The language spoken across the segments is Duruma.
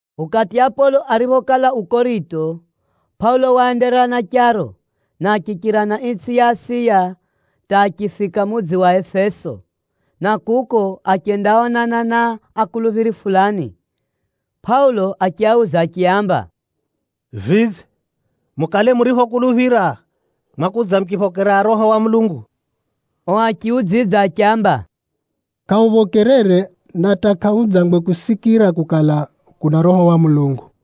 Ukati Apolo ariphokala u Korito, Pʼaulo waenderera na charo, na achichira na itsʼi ya Asiya hata achifika mudzi wa Efeso, na kuko achendaonana na akuluphiri fulani. Pʼaulo achiauza achiaamba, “Vidze, mukale muriphokuluphira, mwakudza muchiphokera Roho wa Mulungu?” O achiudzidza achiamba, “Kʼahuphokerere! Na hata kʼahudzangwe kusikira kukala, kuna Roho wa Mulungu.”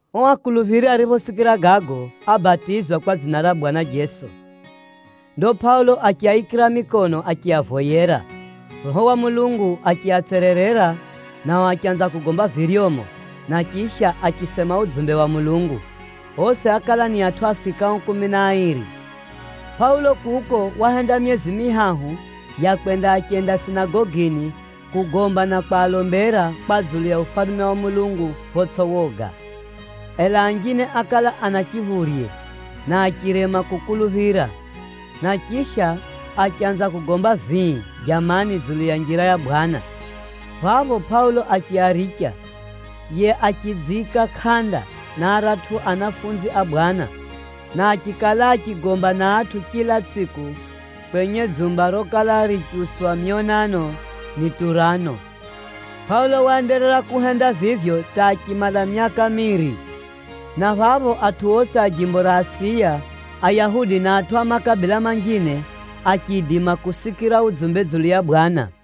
O akuluphiri ariphosikira gago, ábatizwa kwa dzina ra Bwana Jeso. Ndo Pʼaulo achiaikira mikono achiavoyera. Roho wa Mulungu achiatsererera, nao achanza kugomba viryomo, na chisha achisema udzumbe wa Mulungu. Osi ákala ni atʼu afikao kumi na airi. Pʼaulo kuko wahenda myezi mihahu ya kwenda achenda sinagogini kugomba na kwalombera kwa dzulu ya Ufalume wa Mulungu photsʼi woga. Ela anjine ákala ana chiphurye, na achirema kukuluphira. Na chisha, achanza kugomba vii jamani dzulu ya Njira ya Bwana. Phapho Pʼaulo achiaricha, yiye achidziika kʼanda na aratʼu anafunzi a Bwana, na achikala achigomba na atʼu chila tsʼiku kwenye dzumba rokala richiuswa myonano ni Turano. Pʼaulo waenderera kuhenda vivyo hata achimala myaka miiri, na phapho atʼu osi a jimbo ra Asiya, Ayahudi na atʼu a makabila manjine, achiidima kusikira udzumbe dzulu ya Bwana.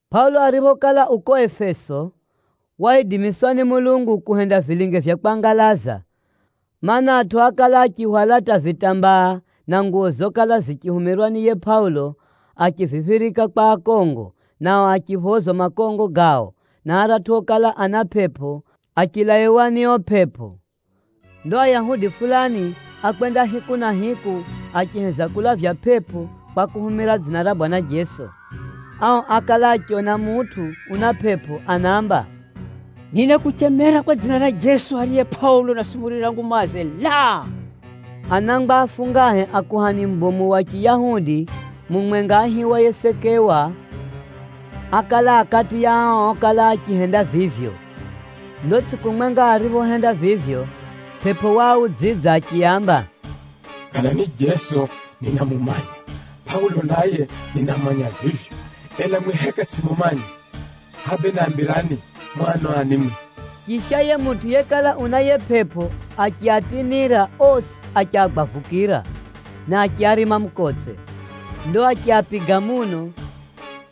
Pʼaulo ariphokala u ko Efeso, waidimiswa ni Mulungu kuhenda vilinge vya kwangalaza. Maana, atʼu ákala achihwala hata vitambaa na nguwo zokala zichihumirwa ni yiye Pʼaulo achiziphirika kwa akongo, nao achiphozwa makongo gao, na aratʼu okala ana pʼepʼo, achilaiwa ni o pʼepʼo. Ndo Ayahudi fulani ákwenda hiku na hiku, achiheza kulavya pʼepʼo kwa kuhumira dzina ra Bwana Jeso. Ao ákala achiona mutʼu una pʼepʼo anaamba, “Ninakuchemera kwa dzina ra Jeso ariye Pʼaulo unasumurira ngumaze, laa!” Anangwa afungahe a kuhani mubomu wa Chiyahudi mumwenga aihiwaye Sekewa, ákala a kati ya ao okala achihenda vivyo. Ndo tsʼiku mwenga ariphohenda vivyo, pʼepʼo waaudzidza achiaamba, “Kala ni Jeso, ninamumanya. Pʼaulo naye, ninamumanya vivyo. Ela mwi heka tsʼimumanya! Hʼa bee nambirani, mu ano ani mwi?” Chisha, yiye mutʼu yekala una yiye pʼepʼo achiatinira osi achiagwavukira, na achiarima mukotse. Ndo achiapiga muno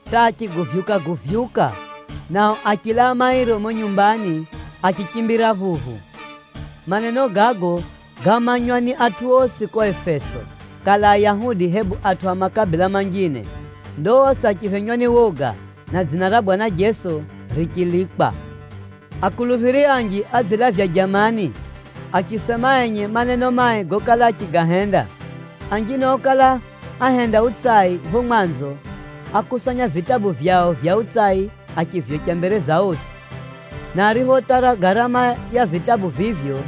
hata achiguvyuka-guvyuka, nao achilaa mairo mumo nyumbani, achichimbira phuphu. Maneno gago gámanywa ni atʼu osi ko Efeso, kala Ayahudi hebu atʼu a makabila manjine. Ndo osi achiphenywa ni woga, na dzina ra Bwana Jeso richilikwa. Akuluphiri anji ádzilavya jamani, achisema enye maneno mai gokala achigahenda. Anjine okala ahenda utsai pho mwanzo, ákusanya vitabu vyao vya utsai achivyocha mbere za osi. Na ariphotara garama ya vitabu vivyo,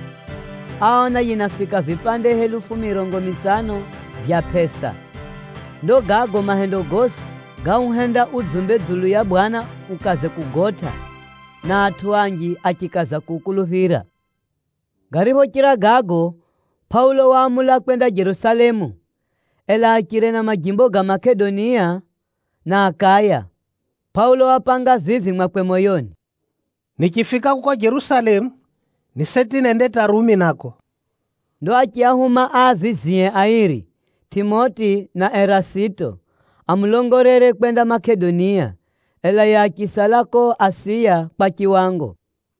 áona yinafika vipande helufu mirongo mitsano vya pʼesa. Ndo gago mahendo gosi gauhenda udzumbe dzulu ya Bwana ukaze kugotʼa, na atʼu anji achikaza kuukuluphira. Gariphochira gago, Pʼaulo waamula kwenda Jerusalemu, ela achire na majimbo ga Makedonia na Akaya. Pʼaulo wapanga vivi mwakwe moyoni, “Nichifika kuko Jerusalemu, ni seti nende hata Rumi nako.” Ndo achiahuma aavizie airi, Tʼimoti na Erasito, amulongolere kwenda Makedonia. Ela yiye achisala ko Asiya kwa chiwango.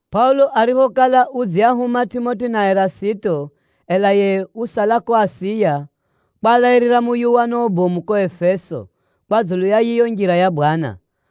Pʼaulo ariphokala udziahuma Tʼimoti na Erasito ela yiye usala ko Asiya, kwalairira muyuwano ubomu ko Efeso, kwa dzulu ya yiyo Njira ya Bwana.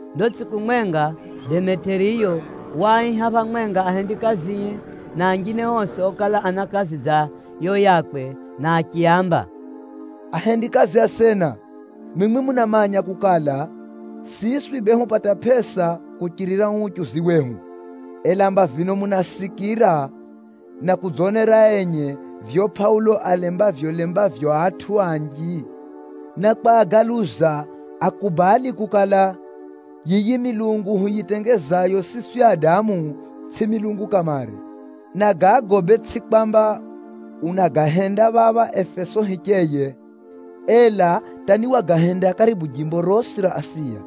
Ndo tsʼiku mwenga Demetiriyo waaiha phamwenga ahendikazie na anjine osi okala ana kazi dza yo yakwe na achiaamba, “Ahendikazi asena, mwimwi munamanya kukala, siswi bee hupata pʼesa kuchirira uu uchuzi wehu. Ela mba vino munasikira na kudzonera enye vivyo Pʼaulo aalembavyolembavyo atʼu anji, na kwagaluza akubali kukala, yiyi milungu huyitengezayo siswi adamu, tsʼi milungu kamare. Na gago bee tsʼi kwamba unagahenda phapha Efeso hicheye, ela hata ni Wagahenda karibu jimbo rosi ra Asiya.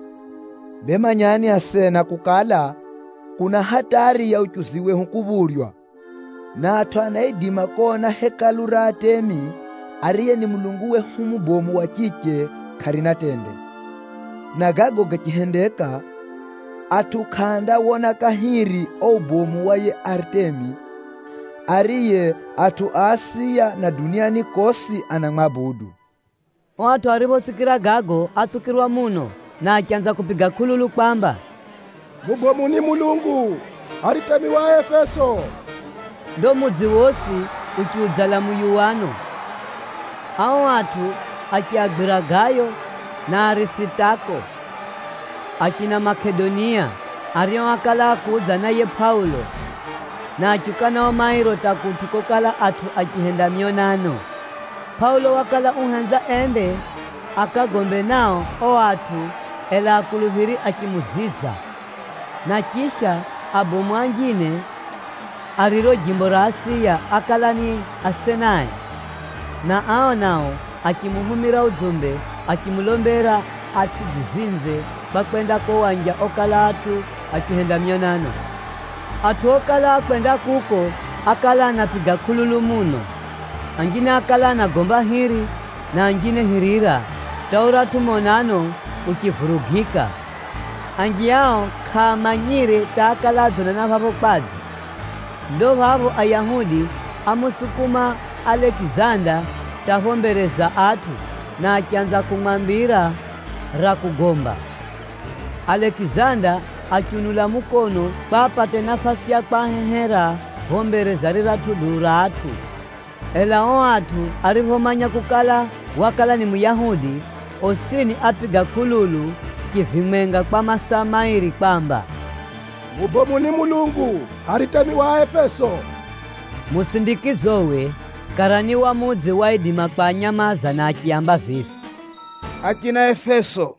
Bee manyani asena kukala, kuna hatari ya uchuzi wehu kuphurywa, na atʼu anaidima kona Hekalu ra Aritemi, ariye ni mulungu wehu mubomu wa chiche, kʼarina tende. Na gago gachihendeka, atʼu kʼaandawona kahiri o ubomu wa yiye Aritemi, ariye atʼu a Asiya na duniani kosi anamwabudu.” O atʼu ariphosikira gago, átsukirwa muno, na achanza kupiga kʼululu kwamba, “Mubomu ni mulungu Aritemi wa Aefeso!” Ndo mudzi wosi uchiudzala muyuwano. Ao atʼu achiagwira Gayo na Arisitako, achina Makedonia, ario ákala ákudza na yiye Pʼaulo, na achiuka nao mairo hata kutʼu kokala atʼu achihenda myonano. Pʼaulo wakala uhenza ende akagombe nao o atʼu, ela akuluphiri achimuziza. Na chisha, abomu anjine a riro jimbo ra Asiya ákala ni asenae, na ao nao achimuhumira udzumbe achimulombera atsʼidzizinze kwa kwenda ko wanja okala atʼu achihenda myonano. Atʼu okala akwenda kuko ákala anapiga kʼululu muno. Anjine ákala anagomba hiri, na anjine hirira hata uratʼu monano uchivurugika. Anji ao kʼaamanyire hata ákala adzonana phapho kwadze. Ndo phapho Ayahudi ámusukuma Alekizanda hata pho mbere za atʼu, na achanza kumwambira ra kugomba. Alekizanda achiunula mukono kwa apate nafasi ya kwahehera pho mbere za riratʼu duu ra atʼu. Ela o atʼu ariphomanya kukala, wakala ni Muyahudi, osini ápiga kʼululu chivimwenga kwa masaa mairi kwamba, “Mubomu ni mulungu Aritemi wa Aefeso!” Musindikizowe, karani wa mudzi waidima kwanyamaza na achiaamba vivi, “Achina Efeso,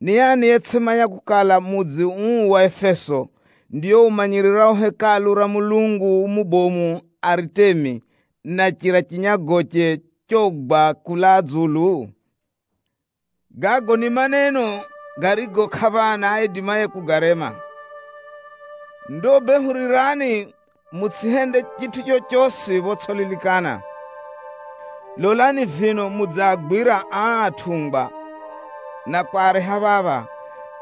ni ani yetsʼimanya kukala, mudzi uu wa Efeso, ndio umanyirirao Hekalu ra mulungu mubomu Aritemi, na chira chinyagoche chogwa kulaa dzulu? Gago ni maneno garigo kʼaphana aidimaye kugarema. Ndo bee hurirani mutsʼihende chitʼu chochosi photsʼililikana. Lolani vino mudziagwira aa atʼungwa na kwareha phapha,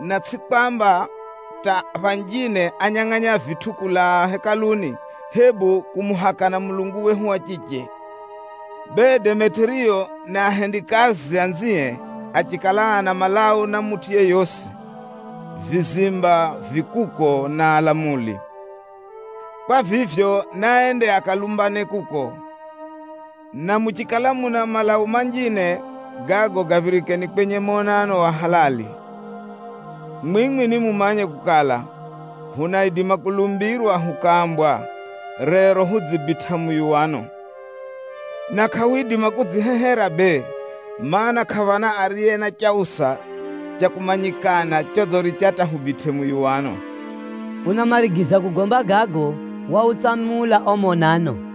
na tsʼi kwamba hata phanjine ányangʼanya vitʼu kulaa Hekaluni, hebu kumuhakana mulungu wehu wa chiche. Bee, Demetiriyo na ahendikazi anzie achikala ana malau na mutʼu yeyosi, vizimba vi kuko na alamuli. Kwa vivyo, naende akalumbane kuko. Na muchikala muna malau manjine, gago gaphirikeni kwenye monano wa halali. Mwimwi nimumanye kukala, hunaidima kulumbirwa hukaambwa, rero hudzibitʼa muyuwano. Na kʼahwidima kudzihehera bee, mana, kʼaphana ariye na chausa cha kumanyikana chodziricha hata hubitʼe muyuwano.” Unamarigiza kugomba gago, wautsamula o monano.